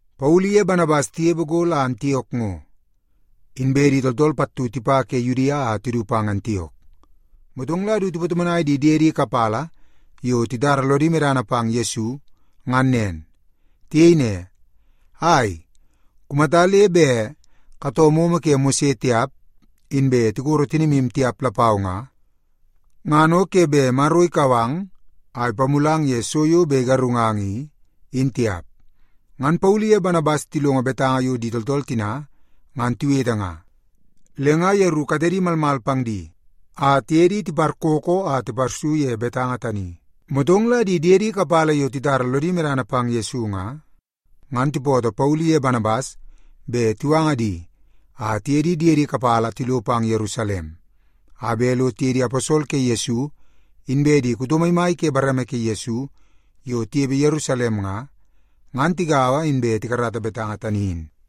Paulu iye Banabas tinepe go la Antiok ngo, inbe di tooltool pattu tipa ke Yudia a tisi pang Antiok. Motong la si tipatomonai di diedi kapala yo titara lodi medana pang Yesu, ngan nen. Tiyei ne, “Ai, kumata le bet katoo momo ke Mose tiap, inbe tikoro tinimu tiap lapau nga, ngan o ke bet Maro ikau ang a ipamulang ye so yo bet igarungang i, in tiap.” Ngan Paulu iye Banabas tilongo betanga yo di tooltool tina ngan tiwete nga, le nga yeru katedi malmal pang di a tiye di tiparkookoo a tiparsu ye betanga tani. Motong la di diedi kapala yo titara lodi medana pang Yesu nga, ngan tipootoo Paulu iye Banabas bet tiwanga di a tiye di diedi kapala tilo pang Yerusalem a bet lo tiye di aposol ke Yesu, inbe di kuto maimai ke bareme ke Yesu yo tinepe Yerusalem nga, ngan tigaua inbe tikarata betanga tani in.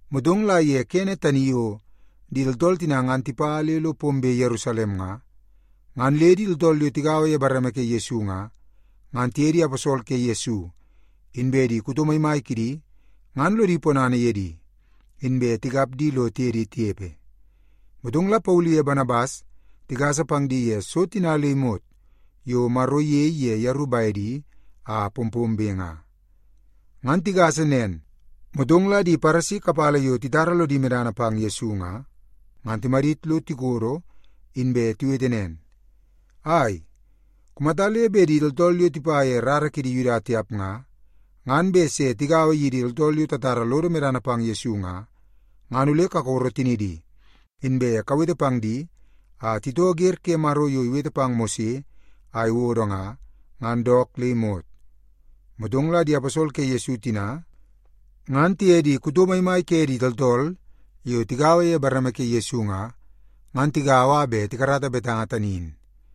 Motong la ye kene tani yo di tooltool tina ngan tipa le lo pombe Yerusalem nga, ngan le di tooltool yo tigaua ye bareme ke Yesu nga, ngan tiye di aposol ke Yesu, inbe di kuto maimai kidi ngan lodi ponana ye di, inbe tikap di lo tiye di tinepe. Motong la Paulu iye Banabas tigasa pang di ye so tina le imot yo Maro iyei ye yeru bedi a pompombe nga. Ngan tigasa nen, motong la di Paresi kapala yo titara lodi medana pang Yesu nga, ngan timadit lo tikodo, inbe tiwete nen, “Ai, kumata le bet di tooltool yo tipa ye rara kidi Yuda tiap nga, ngan bet se tigaua yidi tooltool yo tatara lodo medana pang Yesu nga, ngan ole kakoro tinidi, inbe kawete pang di a titoo wer ke Maro yo iwete pang Mose a iwodo nga, ngan dook le imot.” Motong la di aposol ke Yesu tina ngan tiye di kuto maimai ke di tooltool yo tigaua ye bareme ke Yesu nga, ngan tigaua a bet tikarata betanga tani in.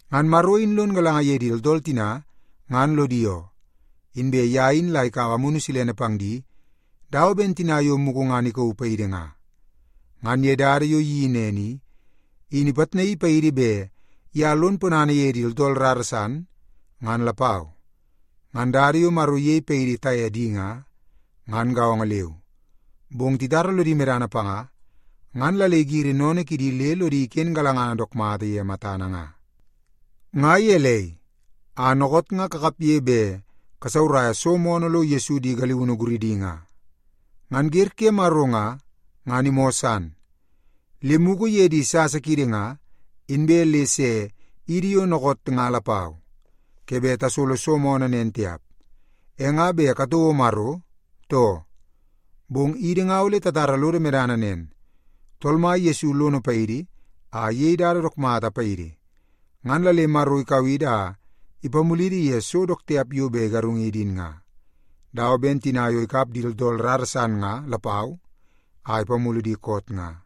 Ngan Maro in lon galanga ye di tooltool tina ngan lodi oo, inbe ye in la ikaua Amunu Silene pang di dawa ben tina yo mugu ngan ikauu paidi nga. Ngan ye dada yo iyeii nen i, in ipitnaii paidi bet ye lon ponana ye di tooltool rara san, ngan lapau. Ngan dada yo Maro iyei paidi taye di nga, ngan gaongo leu. Bong titara lodi medana panga, ngan la le igiri sennene kidi le lodi iken galangana dook mata ye matana nga. Nga gelei, a dookoot nga kakapge bet kasauraia so moonoo lo Yesu di galiunu guridi nga? Ngan wer ke Maro nga, ngan imoo san, le mugu ye di sasa kiidi nga inbe le se yidi yo dookoot nga lapau, ke bet tasolo so moonoo nen tiap. E nga bet katouo Maro, too? Bong idi nga ole tatara lodo medana nen; Tool Mai Yesu lono paidi a iyei dada dook mata paidi, ngan la le Maro ikau idi a ipamulidi ye so dook tiap yo bet igarungidi in nga, dawa ben tina yo ikap di tooltool rara san nga lapau a ipamulu di koot nga.”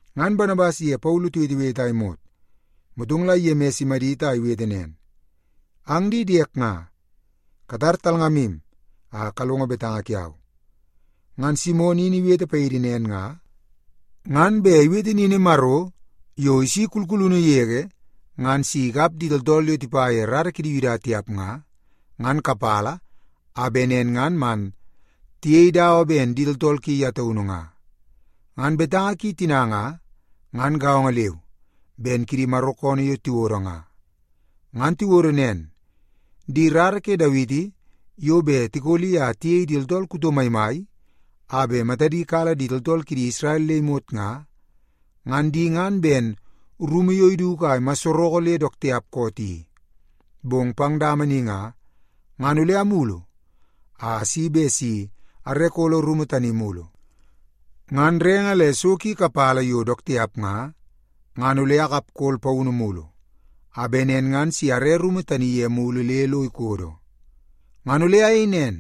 Ngan Banabas iye Paulu tiwetewete a imot, motong la Yemis imadit a iwete nen, “Ang di diek nga, katar talngamu a kalongo betanga kiau. Ngan Simon in iwete paidi nen nga, ngan bet iwete nini Maro yo isi kulkulunu yege ngan si ikap di tooltool yo tipa ye rara kidi Yuda tiap nga, ngan kapala, a bet nen ngan man tiyei dawa ben di tooltool ki ye taunu nga. Ngan betanga ki tina nga, ngan gaongo leu ben kidi Maro koonoo yo tiwodo nga. Ngan tiwodo nen, ‘Di rara ke Dawiti yo bet tikoli a tiyei di tooltool kuto maimai a bet matadi kala di tooltool kidi Isrel le imot nga, ngan di ngan ben rumu yo iduku a imasareke le dook tiap koot i. Bong pang dama ni nga, ngan ole amulu a asi bet si are kolo rumu tani mulu. Ngan renge le so ki kapala yo dook tiap nga, ngan ole akapkol paunu mulu, a bet nen ngan si are rumu tani ye mulu le lo ikodo. Ngan ole ayei nen,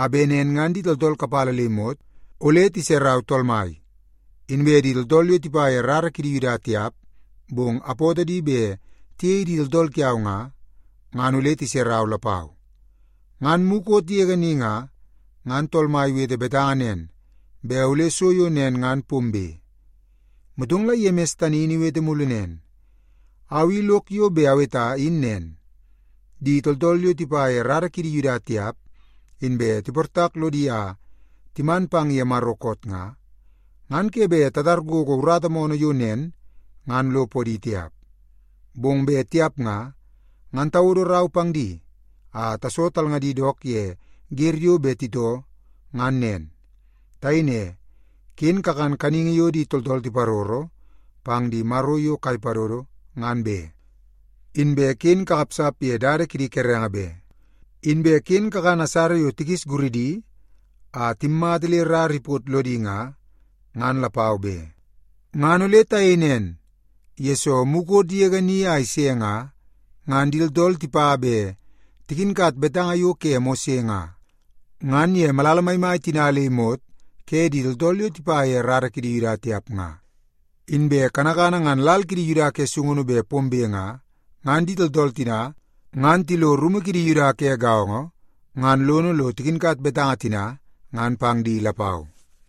a bet nen ngan di tooltool kapala le imot ole tiserau Tool Mai, inbe di tooltool yo tipa ye rara kidi Yuda tiap bong apootoo di bet tiyei di tooltool kiau nga, ngan ole tiserau lapau. Ngan mukot yege ni nga, ngan Tool Mai iwete betanga nen bet ole so yo nen ngan pombe.’” Motong la Yemis tani in iwete mulu nen, “Au i lok yo bet aweta in nen; di tooltool yo tipa ye rara kidi Yuda tiap inbe tiportak lodi a timan pang ye Maro koot nga, ngan ke bet tatar gogo urata moonoo yo nen ngan lo podi tiap. Bong bet tiap nga, ngan tawodo rau pang di a taso talngadi dook ye wer yo bet titoo, ngan nen. Tayei ne, ‘Ken kakan kaningi yo di tooltool tiparoro pang di maro yo kai padodo, ngan be. Inbe ken kakapsap ye dada kidi kerenge be. Inbe ken kakan asara yo tikis guridi a timmata le rara ipot lodi nga, ngan lapau be.’ “Ngan ole tayei nen, yesoo mukot yege ni a ise nga, ngan di tooltool tipa bet tikinkat betanga yo ke Mose nga, ngan ye malala maimai tina le imot ke di tooltool yo tipa ye rara kidi Yuda tiap nga, inbe kanakana ngan lal kidi Yuda ke sungunu bet pombe nga, ngan di tooltool tina ngan tilo rumu kidi Yuda ke gaongo ngan lono lo tikinkat betanga tina ngan pang di lapau.”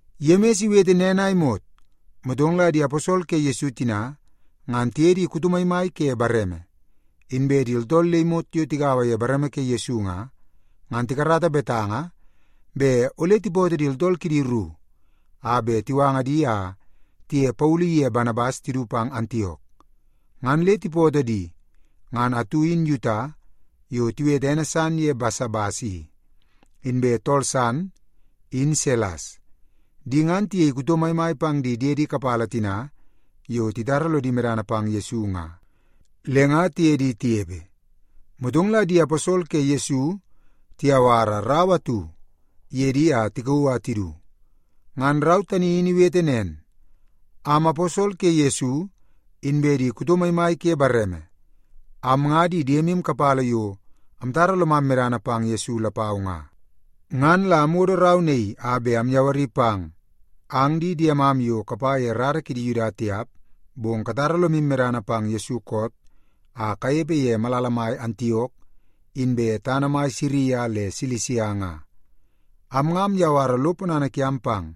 Yemis iwete nen a imot, motong la di aposol ke Yesu tina ngan tiye di kuto maimai ke bareme, inbe di tooltool le imot yo tigaua ye bareme ke Yesu nga, ngan tikarata betanga bet ole tipootoo di tooltool kidi ru a bet tiwanga di a tiye Paulu ye Banabas tidu pang Antiok. Ngan le tipootoo di, ngan atu in Yuta yo tiwete ene san ye Basabas i, inbe tool san in Silas. Di ngan tiyei kuto maimai pang di diedi kapala tina yo titara lodi medana pang Yesu nga, le nga tiye di tinepe. Motong la di aposol ke Yesu tiyawara rau atu ye di a tikauu a tidu. Ngan rau tani in iwete nen, Am aposol ke Yesu, inbe di kuto maimai ke bareme, am nga di diemu kapala yo amtara lomam medana pang Yesu lapau nga. Ngan la amwodo rau naii a bet amyawari pang, ang di diemam yo kapa ye rara kidi Yuda tiap, bong katara lomu medana pang Yesu koot a kanepe ye malala mai Antiok, inbe tana mai Siria le Silisia nga. Am nga amyawara lo ponana kiam pang.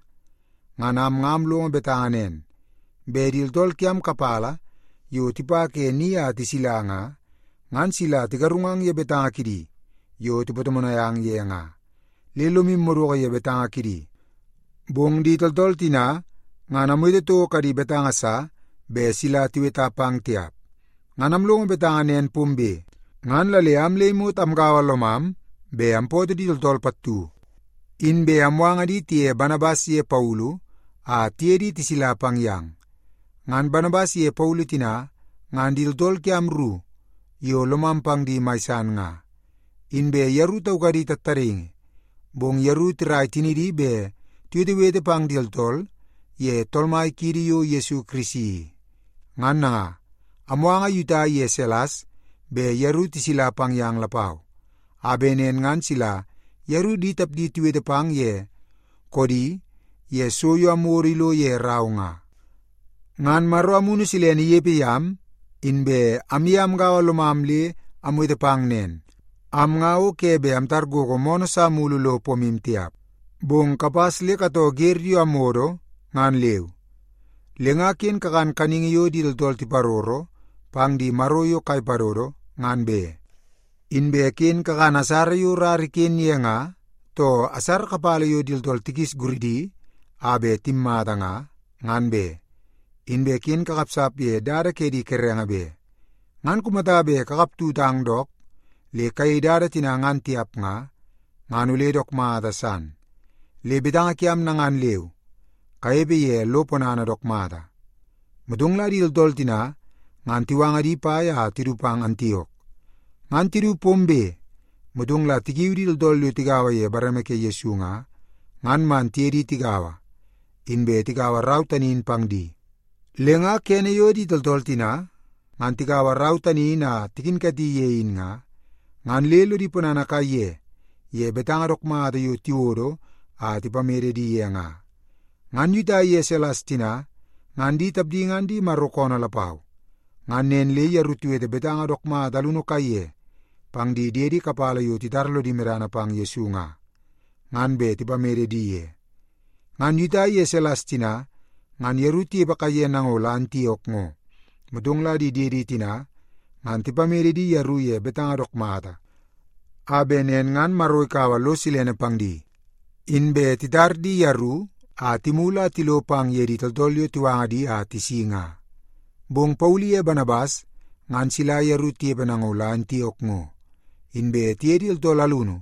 Ngan am nga amlongo betanga nen, bet di tooltool kiam kapala yo tipa ke ni a tisila nga, ngan sila tigarungang ye betanga kidi yo tipatomonai ang ye nga, le lomu madoko ye betanga kidi. Bong di tooltool tina ngan amwete toko kadi betanga sa bet mala tiweta pang tiap. Ngan amlongo betanga nen pombe, ngan la le am le imot amgaua lomam bet ampootoo di tooltool pattu, inbe amwanga di tiye Banabas ye Paulu a tiye di tisila pang yang. Ngan Banabas iye Paulu tina ngan di tooltool kiam ru yo lomam pang di mai san nga. Inbe yeru taukadi tattadaingi, bong yeru tirai tinidi bet tiwetewete pang di tooltool ye Tool Mai kiidi yo Yesu Kirisi i. Ngan nanga, amwanga Yuta iye Silas bet yeru tisila pang yang lapau, a bet nen ngan sila yeru di tapdi tiwete pang ye koodi ye so yo amwodo ilo ye rau nga. Ngan Maro Amunu Silene inepe yam, inbe amye amgaua lomam le amwete pang nen. Am nga o ke bet amtar gogo moonoo sa mulu lo pomu tiap, bong kapas le katoo wer yo amwodo ngan leu. Le nga ken kakan kaningi yo di tooltool tiparoro pang di maro yo kai padodo, ngan be. Inbe ken kakan asara yo rara iken ye nga, too asara kapala yo di tooltool tikis guridi a bet timmata nga, ngan be. Inbe ken kakapsap ye dada ke di kerenge be. Ngan kumata bet kakap tutang dook le kayei dada tina ngan tiap nga, ngan ole dook mata san. Le betanga kiam nanga leu. Kanepe ye lo ponana dook mata. Motong la di tooltool tina ngan tiwanga di pai a tidu pang Antiok. Ngan tidu pombe, motong la tikiu di tooltool yo tigaua ye bareme ke Yesu nga, ngan man tiye di tigaua, inbe tikaua rau tani in pang di. Le nga kene yo di tooltool tina ngan tikaua rau tani in a tikinkati ye in nga, ngan le lodi ponana kaiye ye betanga dook mata yo tiwodo a tipamede di ye nga. Ngan Yuta iye Silas tina ngan di tapdi ngan di Maro koonoo lapau. Ngan nen le yeru tiwete betanga dook mata alunu kaiye pang di diedi kapala yo titara lodi medana pang Yesu nga, ngan bet tipamede di ye. Ngan Yuta iye Silas tina ngan yeru tinepe kaiye nango la Antiok ngo, motong la di diedi tina ngan tipamede di yeru ye betanga dook mata, a bet nen ngan Maro ikaua lo silene pang di, inbe titar di yeru a timulu a tilo pang ye di tooltool yo tiwanga di a tisi nga. Bong Paulu iye Banabas ngan sila yeru tinepe nango la Antiok ngo, inbe tiye di tooltool alunu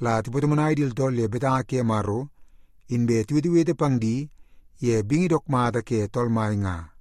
la tipatomonai di tooltool ye betanga ke Maro, inbe tiwetewete pang di ye bingi dook mata ke Tool Mai nga.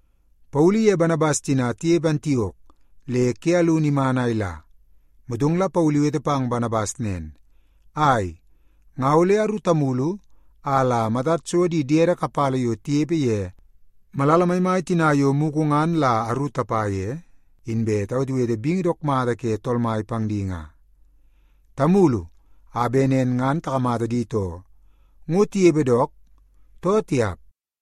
Paulu iye Banabas tina tinepe Antiok le ke alunu iman a ila, motong la Paulu iwete pang Banabas nen, “Ai, nga ole aru tamulu a la matad so di diedi kapala yo tinepe ye malala maimai tina yo mugu ngan la aru tapa ye, inbe tawetewete bingi dook mata ke Tool Mai pang di nga. Tamulu a bet nen ngan takamata di too, ngo tinepe dook, too tiap.”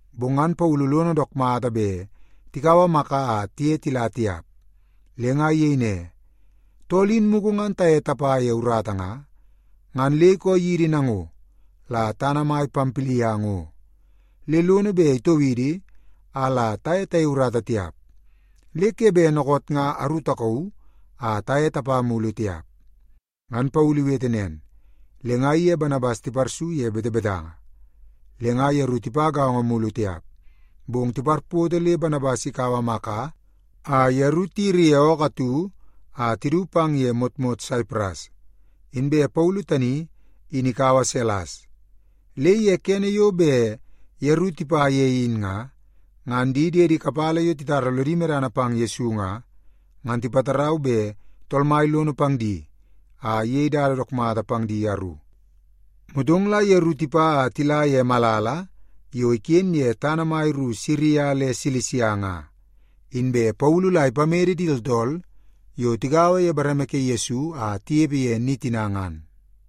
Bong ngan Paulu lono dook mata bet tikaua Maka a tiye tila tiap, le nga iyei ne, “Tool in mugu ngan taye tapa ye urata nga, ngan le ikoo yidi nango la tana mai Pampilia ngo, le lono bet itoo idi a la taye tayei urata tiap. Le ke bet dookoot nga aru takauu a taye tapa mulu tiap.” Ngan Paulu iwete nen, le nga iye Banabas tiparsu ye betebetanga. Le nga yeru tipa gaongo mulu tiap, bong tiparpoto le Banabas ikaua Maka a yeru tiyiri ye ookoo atu a tidu pang ye motmot Saipras. Inbe Paulu tani in ikaua Silas. Le ye kene yo bet yeru tipa ye in nga, ngan di diedi kapala yo titara lodi medana pang Yesu nga, ngan tipatarau bet Tool Mai lono pang di a iyei dada dook mata pang di yeru. Motong la yeru tipa a tila ye malala yo iken ye tana mai ru Siria le Silisia nga, inbe Paulu la ipamede di tooltool yo tigaua ye bareme ke Yesu a tinepe ye ni tina ngan.